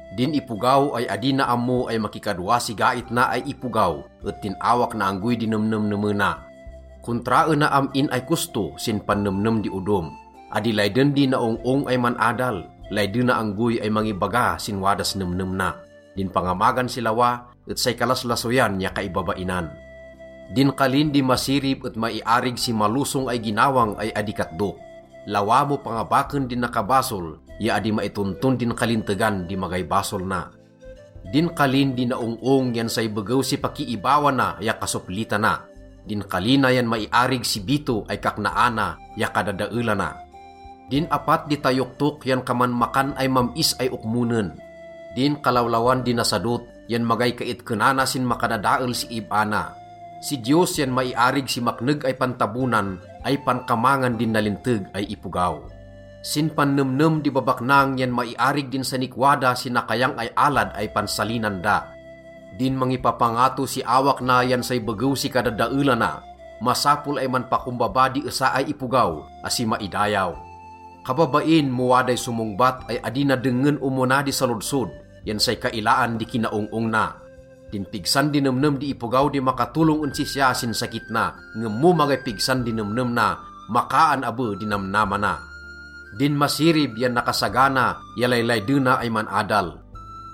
Din ipogaw ay adi na ammo ay makikadwa si gait na ay ipogaw et din awak na anggoy di nemnemnemena. Kontraena am-in ay kosto sin pannemnem di odom. Adi layden di naong-ong ay man-adal, laydena anggoy ay mangibaga sin wadas nemnem na. Din pangamagan si lawa et say kalaslasoyan ya kaibabainan. Din kalin di masirib et maiarig si malosong ay ginawang ay adi katdok. Lawa mo pangabaken din nakabasol ya adi maitonton din kalintegan di magay basol na. Din kalin di naong-ong yan say begew si pakiibawana ya kasoplitana. Din kali na yan maiarig si bito ay kaknaana ya kadadaelana. Din apat di tayoktok yan kaman makan ay mam-is ay okmonen. Din kalawlawan di nasadot yan magay kaitkenana sin makadadael si ib-a na. Si Diyos yan maiarig si makneg ay pantabonan ay pankamangan din nalinteg ay ipogaw. Sin pannemnem di babaknang yan maiarig din sanikwa da si nakayang ay alad ay pansalinan da. Din mangipapangato si awak na yan say begew si kadadaelana. Masapol ay manpakombaba di esa ay ipogaw, asi maidayaw. Kababain mo waday somongbat ay adi na dengngen omona di salodsod, yan say kailaan di kinaong-ong na. Din pigsan di nemnem di ipogaw di makatolong en sisya sin sakit na, ngem mo magay pigsan di nemnem na, makaan abe di namnama na. Din masirib yan nakasagana ya laylaydena ay man-adal.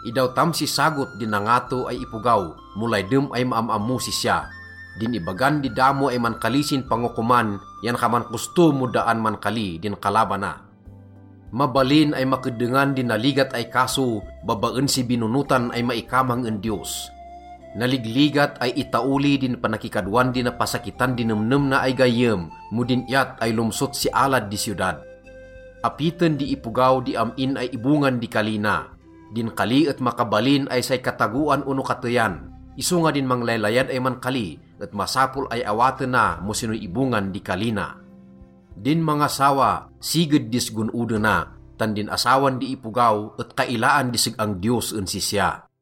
Idawtam si sagot din nangato ay ipogaw mo laydem ay maam-ammos sisya. Din ibagan di damo ay mankali sin pangokoman yan kaman kosto mo daan mankali din kalabana. Mabalin ay makeddengan di naligat ay kaso babaen si binonotan ay maikamang en Diyos. Naligligat ay itaoli din panakikadwan di napasakitan di nemnem na ay gayyem mo din iyat ay lomsot si alad di siyodad. Apiten di ipogaw di am-in ay ibongan di kali na. Din kali et makabalin ay say katagoan ono kateyan, isonga din manglaylayad ay mankali et masapol ay awatena mo sinoy ibongan di kali na. Din mangasawa, siged dis gon-odena, tan din asawan di ipogaw et kailaan di seg-ang Diyos en sisya.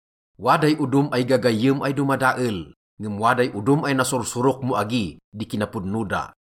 Waday odom ay gagayyem ay domadael, ngem waday odom ay nasursurok mo agi di kinapodno da.